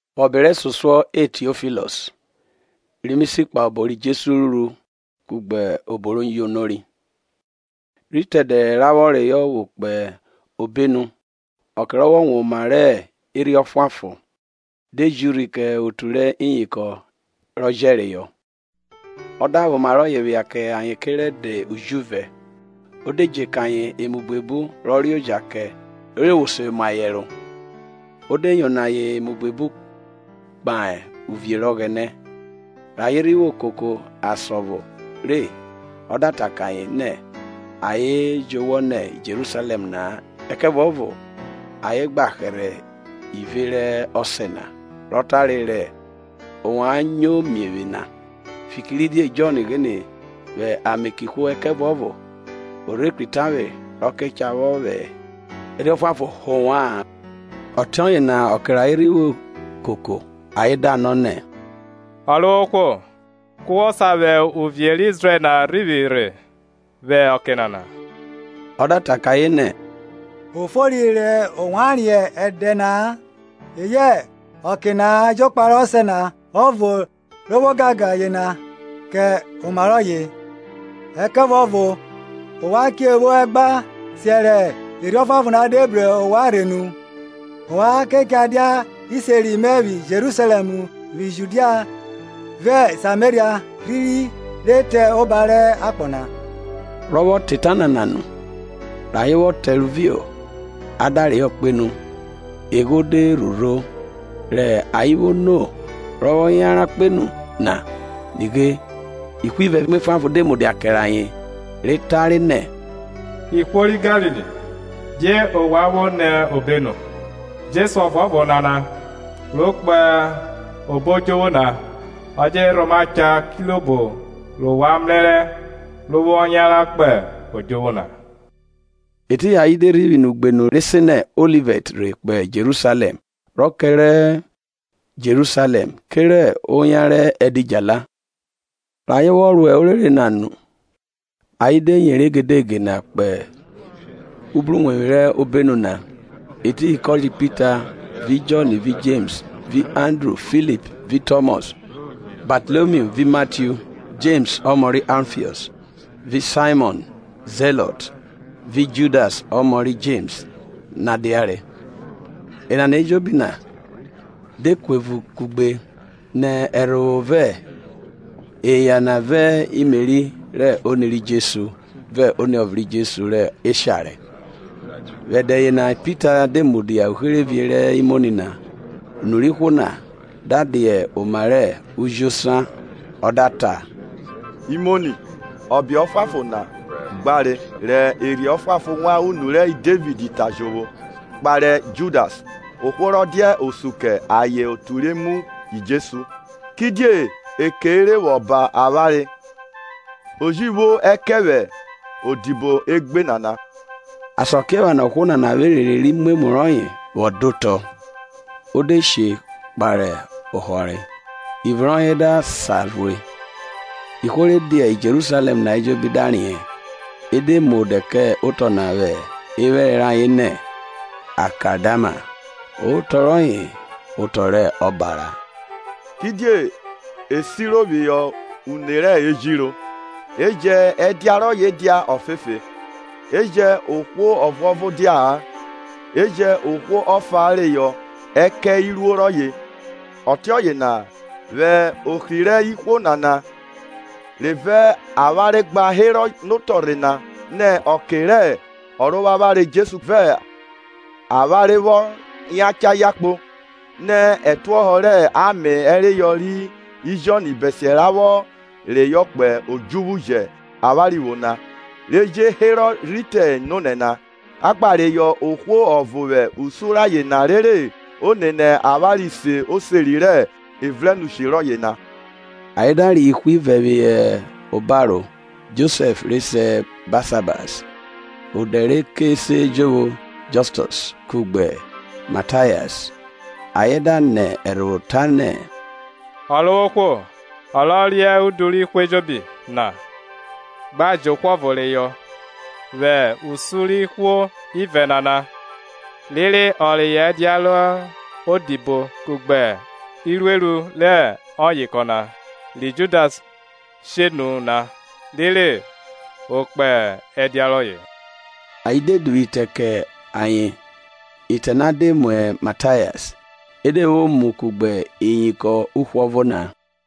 Vwẹ ọbe resosuọ E Tiofilọs, ri mi si kpahe obo ri Jesu ruru kugbe obo ro yonori. Rhi te ẹdẹ ra vwọ reyo vwo kpo obenu, ọke ro vwọ wan oma rẹ Erhi Ọfuanfon, de ji urhi kẹ otu rẹ iyinkọn rọ jẹreyọ. O da vwẹ oma rọye phia kẹ ayen kere ẹdẹ ujuvẹ, o de dje kẹ ayen emu buebu rọ reoja kẹ rere ovwo se mu ayen ẹro, ode yono ayen emu buebu kpahe uvie rẹ Ọghẹnẹ. Re ayen rhi vwo koko asan ọvo re ọ da ta kẹ ayen nẹ ayen jowọ nẹ Jerusalẹm na-a ẹkẹvuọvo ayen gba hẹrhẹ ive rẹ Ọsẹ na, rọ tare, rẹ ovwan nyo mie vwe na. Fikiridie Jọn ghine vwẹ ame kẹ ihwo ẹkẹvuọvo o rhe kri tavwe rọ ke cha vwẹ Erhi Ọfuanfon họ ovwa-an. Ọtiọye na ọke rẹ ayen rhi vwo koko, ayen da nọ nẹ, Ọrovwohwo, ke wọ sa vwẹ uvie rẹ Izrẹl na rhivwi rhe vwẹ ọke nana? Ọ da ta kẹ ayen nẹ, O fori rẹ ovwan vwọ riẹn ẹdẹ na-a eyẹ ọke na-a jokpa rẹ Ọsẹ na ọvo rọ vwẹ ogangan yena kẹ oma rọye. Ẹkẹvuọvo ovwan che vwo ẹgba siẹ rẹ Ẹrhi Ọfuanfon na de bru ovwan rhe nu; ovwan ke cha dia iseri mẹ vwi Jerusalẹm, vwi Judia, vẹ Sameria, rhiri re te oba rẹ akpọ na. Rọ vwọ ta eta nana nu, rẹ ayen vwọ tẹrovio a da reyọ kpenu, egho na de rhurho. Rẹ ayen vwo no rọ vwọ yanran kpenu, na, nighe, ihwo ivẹ vẹ emwa efuanfon de mudia kẹrẹ ayen. Ayen da ta, Ihwo ri Galili, die ovwan vwo ni obenu? Jesu ọvuọvo nana, ro kpo obo odjuvwu na, ọ je rhoma cha kirobo rẹ ovwan mrẹrẹ rọ vwọ yanran kpo odjuvwu na. Etiyin ayen de rhivwi nẹ ugbenu re se nẹ Olivẹt rhe kpo Jerusalẹm rọ kẹrẹ Jerusalẹm kerẹ oyan rẹ edidjala. Rẹ ayen vwọ ro orere na nu, ayen de yeri egegede na kpo ubruwevwi rẹ obenu na, etiyin kọye Pita vẹ Jọn, Jems vẹ Andru, Phihp vẹ Tọmọs, Batalomio vẹ Matiu, Jems ọmọ rẹ Alfiọs vẹ Saimọn rẹ Zilọt vẹ Judas ọmọ rẹ Jems diare. Enana ejobi na de kuevun kugbe nẹ ẹrhovwo, vẹ eya na vẹ Meri rẹ oni ri Jesu, vẹ iniọvọ ri Jesu rẹ eshare. Vwẹ ẹdẹ yena Pita de mudia uherevie rẹ imoni na unu rẹ ihwo na da dia oma rẹ ujosan, ọ da ta, Imoni, ọbe ọfuanfon na gbare rẹ Erhi Ọfuanfon wan unu rẹ Devid ta jovwo, kpahe Judas, ohwo rọ dia osun kẹ ayen otu ri mu Jesu. Kidie ekeire vwọ ba avwanre, o ji vwo ẹkẹn vwẹ odibo egbe nana. Asakiephana ohwo nana vwẹ erere rẹ umwemwu rọye vwọ dẹ otọ; o de she vwẹ uyovwi kotọ; ivun rọye da sarhue. Ihwo re dia Jerusalẹm na ejobi da riẹn; e de mu odẹ kẹ otọ na vwe ephẹrẹ rayen nẹ, Akaldama, otọ rọye otọ rẹ Ọbara. Kidie e siro phihọ Une rẹ Ejiro. E jẹn ẹdia rọye dia ofefe, E jẹn ohwo ọvuọvo dia-a, E jẹn ohwo ọfa reyọ ẹkẹn iruo rọye. Ọtiọye na vwẹ ohri rẹ ihwo nana re vẹ avwanre gba herọ notọrhe na nẹ ọke rẹ Ọrovwavwanre Jesu vẹ avwanre vwọ yacha yakpo, nẹ ẹtuohọ rẹ ame–ereyọ ri Jọn–bẹsiẹ ra vwọ reyọ kpo odjuvwu jẹ avwanre vwo na, re je herọ rhi te nonẹ na, a gba reyọ ohwo ọvo vwẹ usun rayen na rere o nene avwanre se oseri rẹ evrẹnushi rọye na. Ayen da reyọ ihwo ivẹ phihọ obaro, Josẹf re se Basahas, odẹ re ke se jovwo Jọstọs, kugbe Matayas. Ayen da nẹ ẹrhovwo ta nẹ Ọrovwohwo, ọ rọ riẹn udu rẹ ihwo ejobi na, gba jẹ ohwo ọvo reyọ vwẹ usun rẹ ihwo ivẹ nana, rere ọ reyọ ẹdia rẹ odibo kugbe irueru rẹ ọyinkọn na, ri Judas she nu na rere o kpo ẹdia rọye. Ayen de duvwu ite kẹ ayen, itẹ na de mu Matayas; e de vwo mu kugbe iyinkọn uhwọvo na.